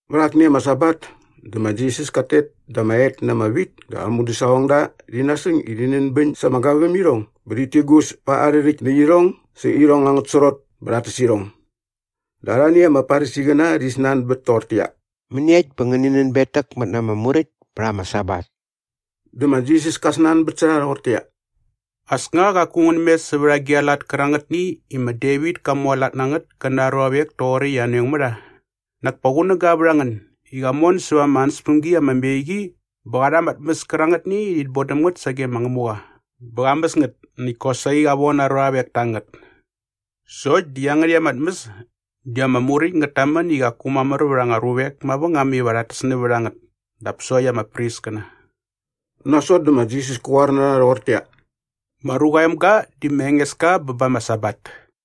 Vät akni ama Sabat dä ma Jisas kat tet da ama et na ama wit dä aa mudäsaqongda rhi nasäng i rhi nänbäñ sa ama gavämirhong bä rhit tigus pa arhä rhäkt nä irhong sä irhong angät srot bä rhat täs irhong. Dä arhani ama Farisiqäna rhi snanbät toqortäqyia, “Mäniekt bä ngänin nänbetäkmät na ama muräkt pät ama Sabat?” Dä ma Jisas ka snanbät sä rha rhoqortäqyia, “As nga qaku ngän mes sävät agi aa lat kärangätni i ma Devit ka mualat na ngät kä na aa ruavek toqoräkt i anoeng mä rha? Nak pa qunäga vät a ngän i qa mon säva ama ansäspämgi ama me qi bä qa rha ama tmäs kärangätni i rhit bodäm ngät sage ma Ngämuqa bä qa mäs ngät näkt kosaqi qa von aa ruavek ta ngät. Sokt di iangärhäkt ama tmäs di ama Muräkt ngät tamän i qaku mamär vät anga ruvek mavängam iva rhat täs nävät a ngät dap sokt ama priskäna.” Nasot dä ma Jisas kä qoar na rha rhoqortäqyia, “Ma Ruqa aa Emga di ma Engeska bä ba ama Sabat.”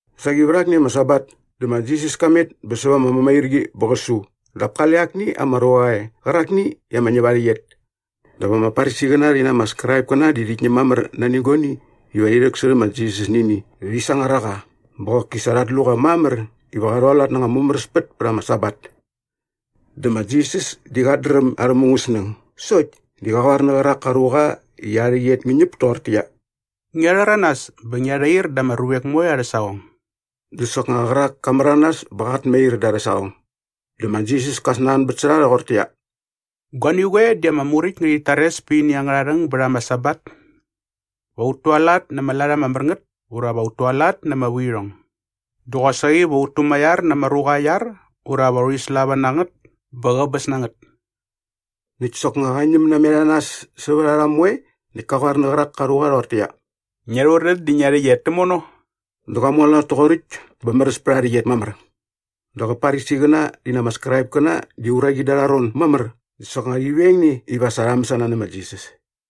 Saqi vät akni ama Sabat dä ma Jisas ka met bä säva ama mämairqi bä qä su dap kale akni ama ruqa e qärakni i ama ñäp aa rhäqyet. Dap ama Farisiqäna rhi na ama Skraipkäna di rhit ñäm mamär nani guani iva rhi rhäksärhä ma Jisas nä ini dä rhi sangar a qa bä qoki sa rhat lu qa mamär iva qa rhualat na anga mumäräspät pät ama Sabat. Dap ma Jisas di qat dräm arhä mungäsnäng sokt di qa qoar nä qärak ka ruqa i aa rhäqyet ngä ñäp doqortäqyia, “Ngia rhäranas bä ngia rhair da ama ruvek moe arhä saqong.” Dä soknga qärak ka märanas bä qat mair da arhä saqong. Dä ma Jisas ka snanbät sä rha rhoqortäqyia, “Guani qoe di ama Muräkt ngärhit tares pät ini angärha rhäng bät ama Sabat? Va ut tualat na ama lat ama mär ngät ura va ut tualat na ama vuirhong? Dä qosaqi va ut tumaiar na ama ruqa aa iar ura va urhi slava na ngät bä qäbäs na ngät?” Näkt soknga qa ñäm namet a nas sävät a rha moe näkt kä qoar nä qärak ka ruqa rhoqortäqyia, “Ngia rhurän dä ngia rhäqyet tämono.” Dä qa mualat toqoräkt bä märäs pät aa rhäqyet mamär. Dap kä Farisiqäna rhi na ama Skraipkäna di uraqi dä arha ron mamär dä soknga rhi veng ne iva sa rha mäsana nä ma Jisas.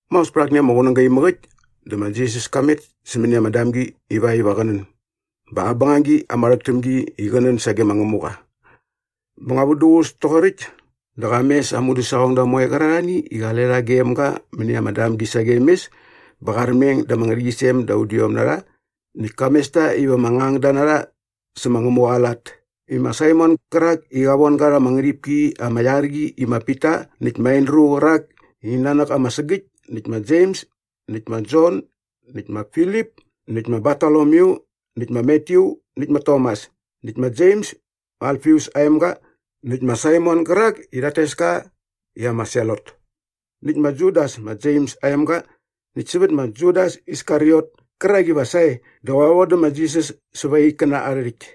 Maos pät akni ama qunäga imäk äkt dä ma Jisas ka met sämäni ama damgi ivakt iva qä nän bä aa bängagi ama rhäk täm gi di qä nän sage ma Ngämuqa. Bä nga vät duququs toqoräkt dä qa mes aa mudäsaqongda moe qärarhani i qale rha gem ga mäni ama damgi sagem mes bä qa armeng da ama ngärhäqyisem da udiom na rha näkt ka mes ta iva ama ngangda na rha sä ma Ngämuqa aa lat i ma Saimon gärak i qa von ga rha ama ngärhipki ama iar qi i ma Pita näkt ma Andru qärak i ain nanäk ama sägäkt näkt ma Jems näkt ma Jon näkt ma Filip näkt ma Bartolomyu näkt ma Matyu näkt ma Tomas näkt ma Jems ma Alfius aa emga näkt ma Saimon gärak i rhat tes ka i ama Selot näkt ma Judas ma Jems aa emga näkt sävät ma Judas Iskariot kärak iva sae dä va qä vodä ma Jisas säva aa ikkäna arhä rhäkt.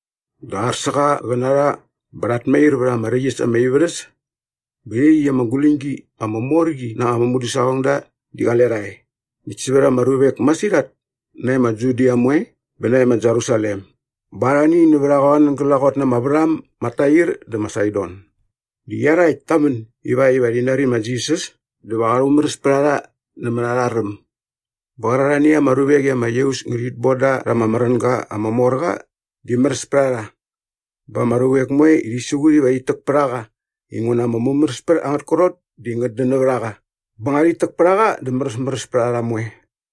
Dä ar sä qa qä na rha bä rhat mair vät ama räkt äs ama ivärhäs. Bä iaqyäkt ama guläñgi ama mor qi na aa mudäsaqongda di qale rha e näkt sävät ama ruvek masirhat nae ma Judia moe bä nae ma Jerusalem bä arhani nävät a qoan glaqot na ama värham ma Tair dä ma Saidon. Di iarhakt ta män ivakt iva rhi nari ma Jisas dä va qa rhumäräs pät a rha nämät arha räm. Bä qärarhani ama ruvek i ama iaus ngärhit bon da rha ama märänga ama mor qa di märäs pät a rha. Bä ama ruvek moe rhi siqut iva rhit täk pät a qa inguna ama mumäräspät angät krot di ngät dän nävät a qa bä nga rhit täk pät a qa dä märäsmäräs pät a rha moe.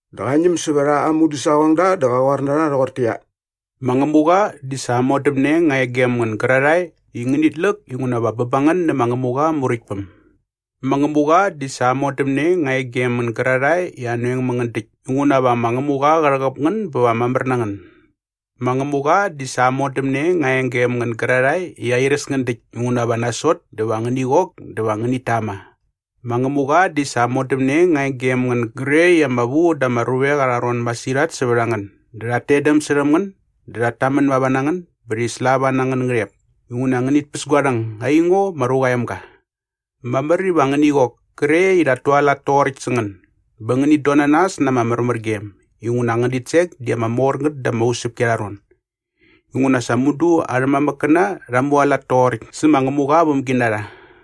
Dä qa ñäm sävät aa mudäsaqongda dä qä qoar na rha rhoqortäqyia, “Ma Ngämuqa di sa aa modämne nga e gem ngän gärarhae i ngänit läk inguna va bä ba ngän nä ma Ngämuqa aa Muräktpäm. “Ma Ngämuqa di sa aa modämne nga e gem ngän gärarhae i anoeng mä ngän däkt inguna va ma Ngämuqa qä rhäqäp ngän bä va mamär na ngän. “Ma Ngämuqa di sa aa modämne nga e gem ngän gärarhae i airäs ngän däkt inguna va nasot dä va ngäni qok dä va ngänit tama. “Ma Ngämuqa di sa aa modämne nga e gem ngän gre i ama vu da ama ruvek arha ron masirhat sävät a ngän dä rhat tetdäm särhäm ngän dä rhat tamän mava na ngän bä rhi slava na angän ngärhep inguna ngänit päs gua rhäng aingo ma Ruqa aa Emga. Mamär iva ngäni qok kre i rhat tualat toqoräkt sä ngän bä ngänit don na nas na ama märmärgem inguna angän ditsek di ama mor ngät da ama usäpki arha ron. Inguna sa mudu arhä mamäkkäna rha mualat toqoräkt sä ma Ngämuqa aa vämginarha.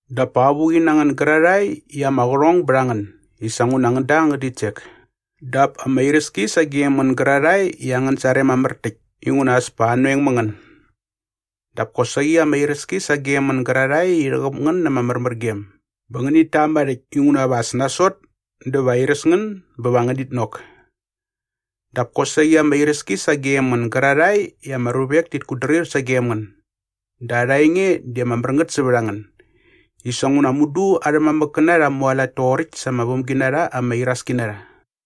“Dap pa avuqi na ngän gärarhae i ama qärhong bät a ngän i sa nguna ngän da angän ditsek. “Dap ama iräski sagem ngän gärarhae i angän sarem mamär täkt inguna as pa anoeng mä ngän. “Dap kosaqi ama iräski sagem ngän gärarhae i rhäqäp ngän na ama märmärgem bä ngänit tama rhäkt inguna va as nasot dä va airäs ngän bä va ngänit nok. “Dap kosaqi ama iräski sagem ngän gärarhae i ama ruvek tit kutdrir sagem ngän dä arha enge di ama mär ngät sävät a ngän i sa nguna mudu arhä mamäkkäna rha mualat toqoräkt sa ama vämginarha ama iraski na rha.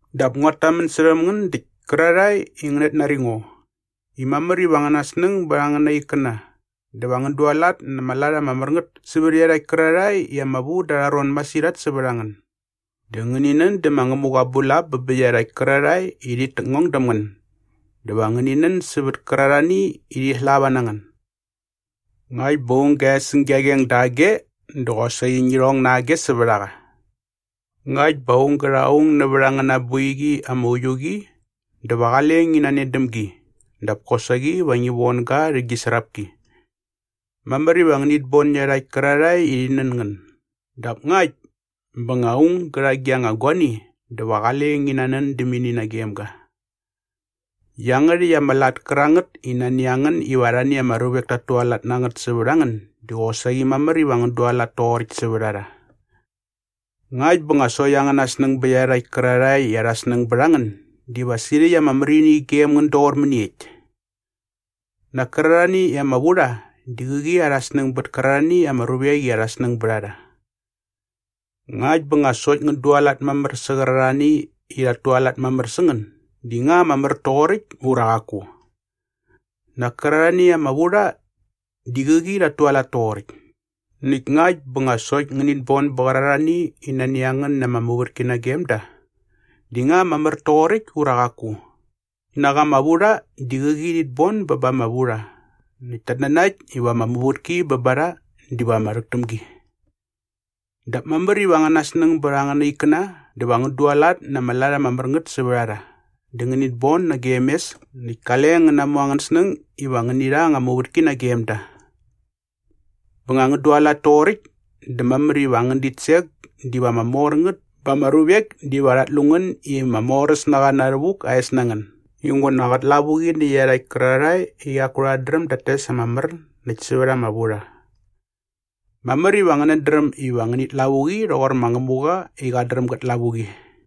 “Dap nguat tamän särhäm ngän däkt kärarhae i ngänät nari ngo i mamär iva angän snäng bät angäna ikkäna dä va ngän dualat na ama lat ama mär ngät sävät iarhakt kärarhae i ama vu da arha ron masirhat sävät a ngän. Dä ngäni nän dä ma Ngämuqa aa bulap bä bä iarhakt kärarhae i rhit täkngong däm ngän dä va ngäni nän sävät kärarhani i rhi slava na ngän. Ngakt bä aung gä e säng gia qeng dage dä qosaqi ngi rhong na age sävät a qa. Ngakt bä nga aung gä rha aung nävät a ngän aa boiqi ama uiu qi dä va qale ngi nanen däm gi dap kosaqi va ngi von ga rha aa srapki. Mamär iva ngänit bon iarhakt kärarhae i rhi nän ngän dap ngakt bä nga aung gä rha gi nga guani dä va qale ngän nanän däm ini nagem ga. Iangärhäkt ama lat kärangät i nani a ngän iva arhani ama ruvek tat tualat na ngät sävät a ngän di qosaqi mamär iva ngän dualat toqoräkt sävät a rha. “Ngakt bä nga sokt angäna snäng bät iarhakt kärarhae i arha snäng bät a ngän diva sirhäkt ama märini gem ngän doqor mäniekt? Nak kärarhani i ama vu rha di qäqi arha snäng bät kärarhani ama ruvek i arha snäng bät a rha. Ngakt bä nga sokt ngän dualat mamär sä qärarhani i rhat tualat mamär sä ngän di nga ama mär toqoräkt ura qaku? Nak kärarhani i ama vu rha di qäqi rhat tualat toqoräkt. Näkt ngakt bä nga sokt ngänit bon bä bä qärarhani i nani a ngän na ama muvätki nagem da di nga ama mär toqoräkt ura qaku? Nak ama vurha di qäqi rhit bon bä ba ama vurha näkt tat nanakt iva ama muvätki bä ba rha diva ama rhäk täm gi. “Dap mamär iva angäna snäng bät angäna ikkäna dä va ngän dualat na ama lat ama mär ngät sävät a rha dä ngänit boda nagem mes näkt kale ngän natmu angän snäng iva ngäni rha anga muvätki nagem da. Bä nga ngän dualat toqoräkt dä mamär iva angän ditsek diva ama mor ngät bä ama ruvek diva rhat lu ngän i ma Moräsnaqa Na Rhävuk aa es na ngän inguna qät lavuqi nä iarhakt kärarhae i qaku rhat dräm dat tes ama mär näkt sävät ama vurha. Mamär iva ngänät dräm iva ngänit lavuqi rhoqor ma Ngämuqa i qat dräm gät lavuqi.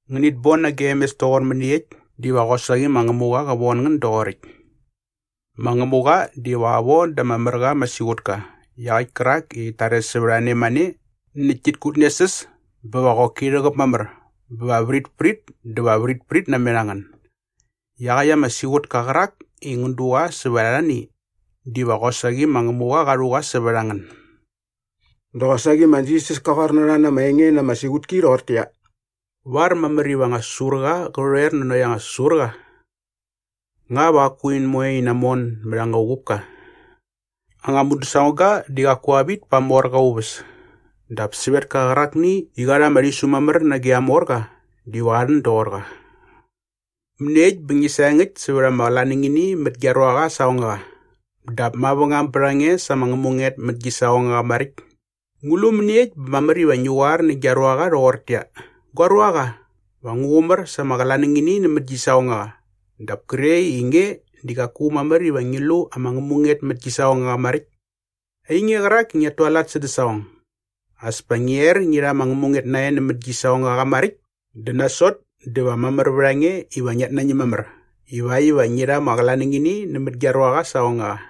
Ngänit bon nagem mes toqor mäniekt diva qosaqi ma Ngämuqa qä von ngän doqoräkt. Ma Ngämuqa diva qä von da ama mär qa ama siqutka iaqäkt kärak i sa rhit tares sävät a ne mane näkt tit kutnesäs bä va qoki rhäqäp mamär bä vritprit dä va vritprit namet a ngän. Iaqäkt ama siqutka qärak i ngän du qa sävät arhani diva qosaqi ma Ngämuqa qa rhu qa sävät a ngän.” Dä qosaqi ma Jisas ka qoar na rha na ama enge na ama siqutki rhoqortäqyia, “Var mamär iva anga säsurqa qä rhoer nanokt anga säsurqa? Nga va qaku in moe in namon mät anga uqupka? Anga mudäsaqongga di qaku qa vit pa aa morqa aa uväs dap sävetka qärakni i qa rha ama rhisu mamär nage aa morqa diva qa rhän doqor qa.” “Mäniekt bä ngi saengäkt sävät ama qlanängini mät gia ruaqa aa saqongaqa dap mavängam bät a nge sa ama ngämunget mät gi saqongaqa maräkt? Ngu lu mäniekt bä mamär iva ngi qoar nä gia ruaqa rhoqortäqyia, ‘Gua ruaqa, va ngu qumär sa ama qlanängini nämät gi saqongaqa’ dap kre i nge di qaku mamär iva ngi lu ama ngämunget mät gi saqongaqa maräkt. Ainge qärak i ngiat tualat sädä saqong, as pa ngi er ngi rha ama ngämunget nae nämät gi saqongaqa maräkt dä nasot dä va mamär vät a nge iva ngiat nañäm mamär ivakt iva ngi rha ama qlanängini nämät gia ruaqa aa saqongaqa.”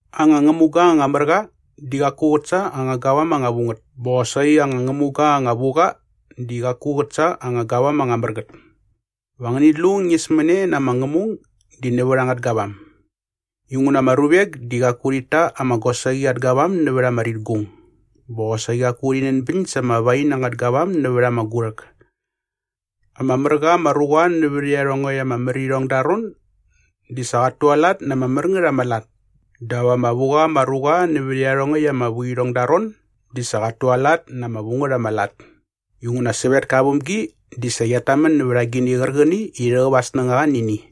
“Anga ngämuga anga mär qa di qaku qät sa anga gavam anga vu ngät bä qosaqi anga ngämuga anga vu qa di qaku qät sa anga gavam anga mär ngät. Va ngäni lu ñismäne na ama ngämung di nävät angät gavam. Inguna ama ruvek di qaku rhit ta ama gosaqi at gavam nävät ama ritgung. Bä qosaqi qaku rhi nänbäñ sa ama wain angät gavam nävät ama gurhäk. Ama mär qa ama ruqa nävät iarhongäkt ama märirhong da aa ron di sa qat tualat na ama mär ngät ama lat dap ama vu qa ama ruqa nävät iarhongäkt ama vuirhong da aa ron di sa qat tualat na ama vu ngät ama lat. Inguna sävetka aa vämgi di sa qiat tamän nävät agini qärqäni i rhäqäp aa snängaqa nä ini.”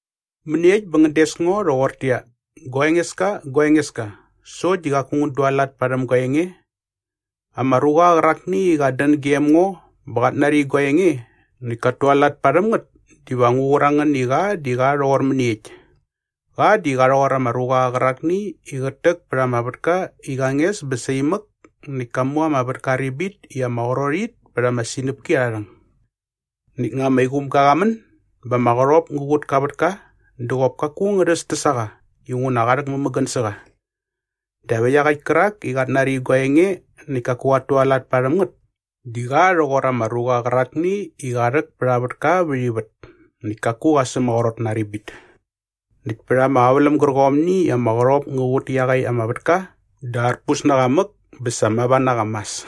“Mäniekt bä ngän des ngo rhoqortäqyia, ‘Gua Engeska, gua Engeska’ sokt di qaku ngän dualat parhäm gua enge? Ama ruqa qärakni i qat dän gem ngo bä qat nari gua enge näkt kat tualat parhäm ngät diva ngu qur a ngän i qa di qa rhoqor mäniekt. Qa di qa rhoqor ama ruqa qärakni i qät täk pät ama vätka i qa nges bä saimäk näkt ka mu ama vätka aa ribit i ama qrot it pät ama sinäpki arha rhäng. Näkt nga ama iqumga qa män bä ama qärhop ngä qut ka vätka dä qop kaku ngä rhästäs a qa inguna qa rhäk mämägän sä qa. Dap iaqäkt kärak i qat nari gua enge näkt kaku qat tualat parhäm ngät di qa rhoqor ama ruqa qärakni i qa rhäk pät aa vätka vät ivät näkt kaku qa sämaqrot na aa ribit. Näkt pät ama qäväläm gärqomni i ama qärhop ngä qut iaqäkt ama vätka dä arpus na qa mäk bä sa mava na qa mas.”